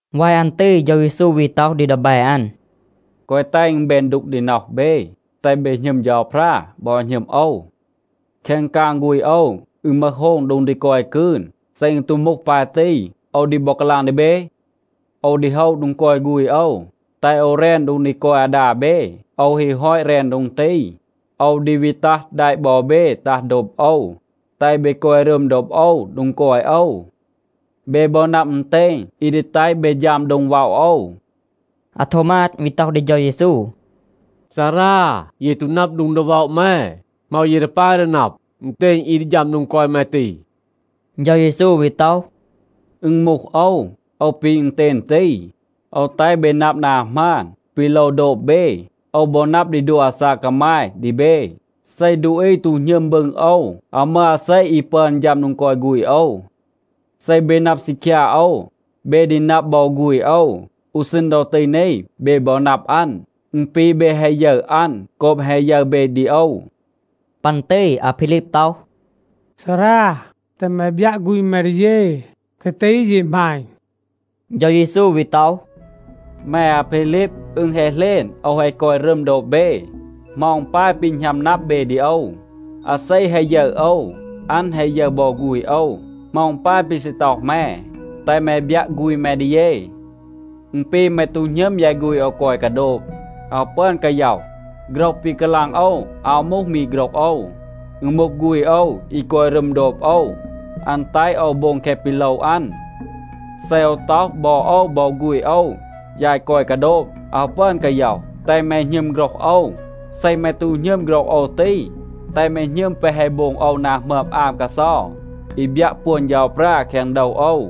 วาย อัน ตี เฌา เยซู วี ต็อห ดี ดีแบ อัน, “แกวะ แตห อึณ แบน ดูก ดี น็อห เบ, แตห เบ หณึม เฌาพรา, บอ หณึม โอว. แคง กาง ฆูณ โอว, อึณ มึห โฮง โดง ดี กอย กืน. เซ อึณ ตู มูห ปาย ตี, โอว ดี บอ กาลาง ดี เบ. โอว ดี โฮะ โดง กอย ฆูณ โอว, แตห โอว แรน โดง ดี กอย อาดา เบ. โอว ฮี ฮอต แรน โดง ตี, โอว ดี วี ตัห แดะ บอ เบ ตัห โดบ โอว, แตห เบ กอย รึม โดบ โอว โดง กอย โอว. เบ บอ นับ อึณเตณ, อี ดี แตห เบ ฌัม โดง ว็อะ โอว.” อาโทวมาด วี ต็อห ดี เฌา เยซู, “ซารา, เย ตู นับ โดง ดี ว็อะ แม. เหมา เย ดี ปาย ดี นับ อึณเตณ อี ดี ฌัม โดง กอย แม ตี?” เฌา เยซู วี ต็อห, “อึณ มูห โอว. โอว ปี อึณเตณ ตี. โอว แตห เบ นับ นา หมาน, ปี โลว โดบ เบ. โอว บอ นับ ดี ดัว อาซาก กามาย ดี เบ. เซ ดูอี ตู หณึม บึง โอว, อาว มึห อาเซ อี ปึอน ฌัม โดง กอย ฆูณ โอว. เซ เบ นับ ซีคยา โอว, เบ ดี นับ บอ ฆูณ โอว. อู ซีณ ดอ ตี นี เบ บอ นับ อัน. อึณ ปี เบ แฮะ ยึร อัน โกบ แฮะ ยึร เบ ดี โอว.” ปัน ตี อาพีลีบ ต็อห, “ซารา, แตห แม บยัะ ฆูณ แม ดี เย. แคะ ตี เย หมาณ.” เฌา เยซู วี ต็อห, “แม อาพีลีบ, อึณ แฮะ เหลณ โอว แฮะ กอย รึม โดบ เบ. เหมา อึณ ปาย ปี หณัม นับ เบ ดี โอว? อาเซ แฮะ ยึร โอว, อัน แฮะ ยึร บอ ฆูณ โอว. เหมา อึณ ปาย ปี ซี ต็อห แม, ‘แตห แม บยัะ ฆูณ แม ดี เย’? อึณ ปี แม ตู หณึม ยาย ฆูณ โอว กอย กาโดบ, อาว ปึอน กาย็อห. โฆรห ปี กาลาง โอว อาว มูห มี โฆรห โอว. อึณ มูห ฆูณ โอว, อี กอย รึม โดบ โอว, อัน แตห โอว โบง แคะ ปี โลว อัน. เซ โอว ต็อห, บอ โอว บอ ฆูณ โอว, ยาย กอย กาโดบ, อาว ปึอน กาย็อห, แตห แม หณึม โฆรห โอว. เซ แม ตู หณึม โฆรห โอว ตี, แตห แม หณึม แปะ แฮะ โบง โอว นา หมึอม อาม กาเซา, อี บยัะ ปวน เฌาพรา แคง โดว โอว.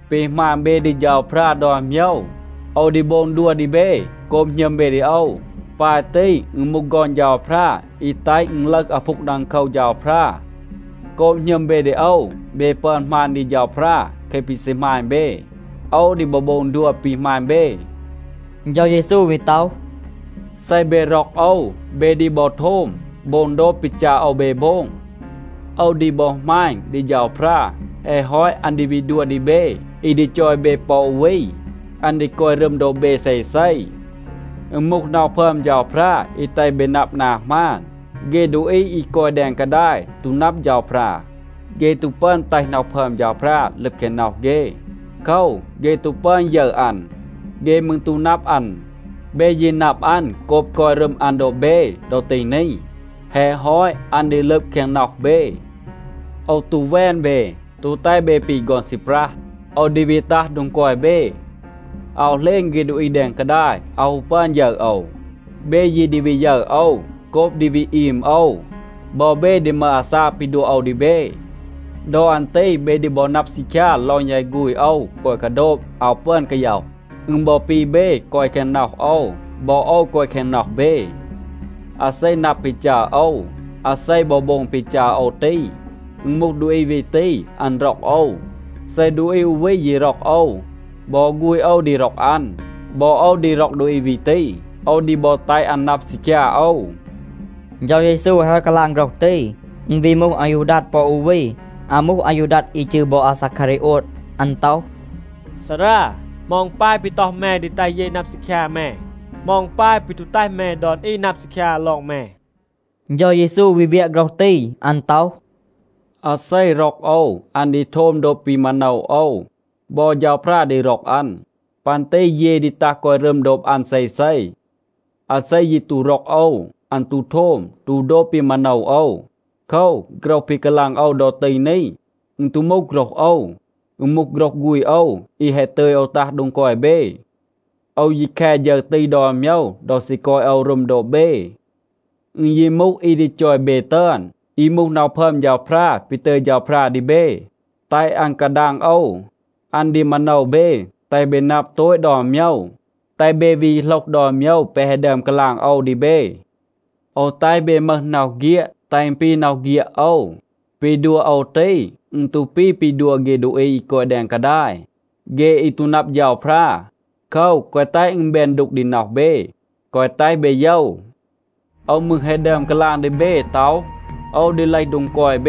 ปี หมาณ เบ ดี เฌาพรา ดอน โมยว โอว ดี โบง ดัว ดี เบ โกบ หณึม เบ ดี โอว. ปาย ตี, อึณ มูห ฆอน เฌาพรา อี แตห อึณ ลึห อาพูง ดังโคว เฌาพรา. โกบ หณึม เบ ดี โอว เบ ปึอน หมาณ ดี เฌาพรา แคะ ปี ซี หมาณ เบ. โอว ดี บอ โบง ดัว ปี หมาณ เบ.” เฌา เยซู วี ต็อห, “เซ เบ ร็อก โอว, เบ ดี บอ โทม โบง โดบ ปี จัร โอว เบ โบง. โอว ดี บอ หมาณ ดี เฌาพรา. แฮะ ฮอต อัน ดี วี ดัว ดี เบ อี ดี จอย เบ ปอ อู วี. อัน ดี กอย รึม โดบ เบ เซเซ. อึณ มูห น็อห พึอม เฌาพรา อี แตห เบ นับ นา หมาน. เฆ ดูอี อี กอย แดง กาดาย ตู นับ เฌาพรา, เฆ ตู ปึอน แตห น็อห พึอม เฌาพรา ลึบ แคง น็อห เฆ. โคว, เฆ ตู ปึอน ยึร อัน. เฆ มืร ตู นับ อัน. เบ ยี นับ อัน โกบ กอย รึม อัน โดบ เบ ดอ ตี นี. แฮะ ฮอต, อัน ดี ลึบ แคง น็อห เบ. โอว ตู แวน เบ, ตู แตห เบ ปี ฆอน ซีปรัห. โอว ดี วี ตัห โดง กอย เบ. อาว เหลณ เฆ ดูอี แดง กาดาย อาว ฮู ปึอน ยึร โอว. เบ ยี ดี วี ยึร โอว. โกบ ดี วี อีม โอว, บอ เบ ดี มึห อาซาก ปี ดัว โอว ดี เบ. ดอ อัน ตี เบ ดี บอ นับ ซีคยา ลอง ยาย ฆูณ โอว กอย กาโดบ, อาว ปึอน กาย็อห. อึณ บอ ปี เบ กอย แคง น็อห โอว, บอ โอว กอย แคง น็อห เบ. อาเซ นับ ปี จัร โอว, อาเซ บอ โบง ปี จัร โอว ตี, อึณ มูห ดูอี วี ตี, อัน ร็อก โอว. เซ ดูอี อู วี ยี ร็อก โอว, บอ ฆูณ โอว ดี ร็อก อัน. บอ โอว ดี ร็อก ดูอี วี ตี. โอว ดี บอ แตห อัน นับ ซีคยา โอว.” เฌา เยซู แฮะ ฮอต กาลาง โฆรห ตี, อึณ วี มูห อายูดัด ปอ อู วี. (อาว มูห อายูดัด อี จืร บอ อาซาคารีโอด). อัน ต็อห, “ซารา, เหมา อึณ ปาย ปี ต็อห แม ดี แตห เย นับ ซีคยา แม. เหมา อึณ ปาย ปี ตู แตห แม ดอน อี นับ ซีคยา ลอง แม?” เฌา เยซู วี เวียะ โฆรห ตี. อัน ต็อห, “อาเซ ร็อก โอว, อัน ดี โทม โดบ ปี มาโนว โอว, บอ เฌาพรา ดี ร็อก อัน. ปัน ตี เย ดี ตัห กอย รึม โดบ อัน เซเซ. อาเซ ยี ตู ร็อก โอว, อัน ตู โทม, ตู โดบ ปี มาโนว โอว. โคว, โฆรห ปี กาลาง โอว ดอ ตี นี, อึณ ตู มูห โฆรห โอว. อึณ มูห โฆรห ฆูณ โอว อี แฮะ ตึย โอว ตัห โดง กอย เบ. โอว ยี แค ฌึร ตี ดอน โมยว ดอ ซี กอย รึม โอว โดบ เบ. อึณ ยี มูห อี ดี จอย เบ ตึอน, อี มูห น็อห พึอม เฌาพรา ปี ตึย เฌาพรา ดี เบ, แตห อัน กาดาง โอว, อัน ดี มาโนว เบ, แตห เบ นับ โตต ดอน โมยว, แตห เบ วี โหลห ดอน โมยว แปะ แฮะ ดึอม กาลาง โอว ดี เบ. โอว แตห เบ มึห น็อห เฆียด, แตห อึณ ปี น็อห เฆียด โอว. ปี ดัว โอว ตี, อึณ ตู ปี ปี ดัว เฆ ดูอี อี กอย แดง กาดาย, เฆ อี ตู นับ เฌาพรา. โคว, แกวะ แตห อึณ แบน ดูก ดี น็อห เบ, แกวะ แตห เบ โยว. โอว มืร แฮะ ดึอม กาลาง ดี เบ ต็อห, ‘โอว ดี เลห โดง กอย เบ.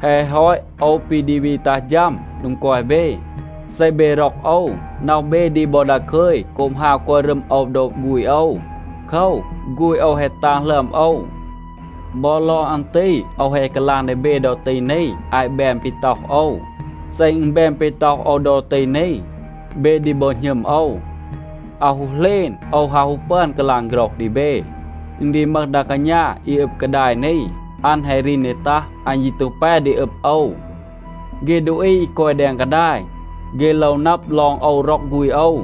แฮะ ฮอต โอว ปี ดี วี ตัห ฌัม โดง กอย เบ.’ เซ เบ ร็อก โอว, น็อห เบ ดี บอ ดาคึย โกบ ฮาว กอย รึม โอว โดบ ฆูณ โอว. โคว, ฆูณ โอว แฮะ ตาง หลึอม โอว. บอ ลอง อัน ตี โอว แฮะ กาลาง ดี เบ ดอ ตี นี อาต แบน ปี ต็อห โอว. เซ อึณ แบน ปี ต็อห โอว ดอ ตี นี, เบ ดี บอ หณึม โอว. อาว ฮู เหลณ, โอว อาว ฮู ปึอน กาลาง โฆรห ดี เบ. อึณ ดี มึห ดา กาณา อี อึบ กาดาย นี, อัน แฮะ รีน ดี ตัห. อัน ยี ตู แป ดี อึบ โอว. เฆ ดูอี อี กอย แดง กาดาย, เฆ โลว นับ ลอง โอว ร็อก ฆูณ โอว.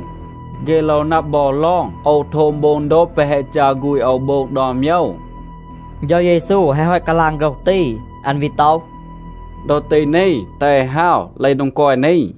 เฆ โลว นับ บอ ลอง โอว โทม โบง โดบ แปะ แฮะ จัร ฆูณ โอว โบง ดอน โมยว.” เฌา เยซู แฮะ ฮอต กาลาง โฆรห ตี. อัน วี ต็อห, “ดอ ตี นี, แตห เอ ฮาว, เลห โดง กอย นี.”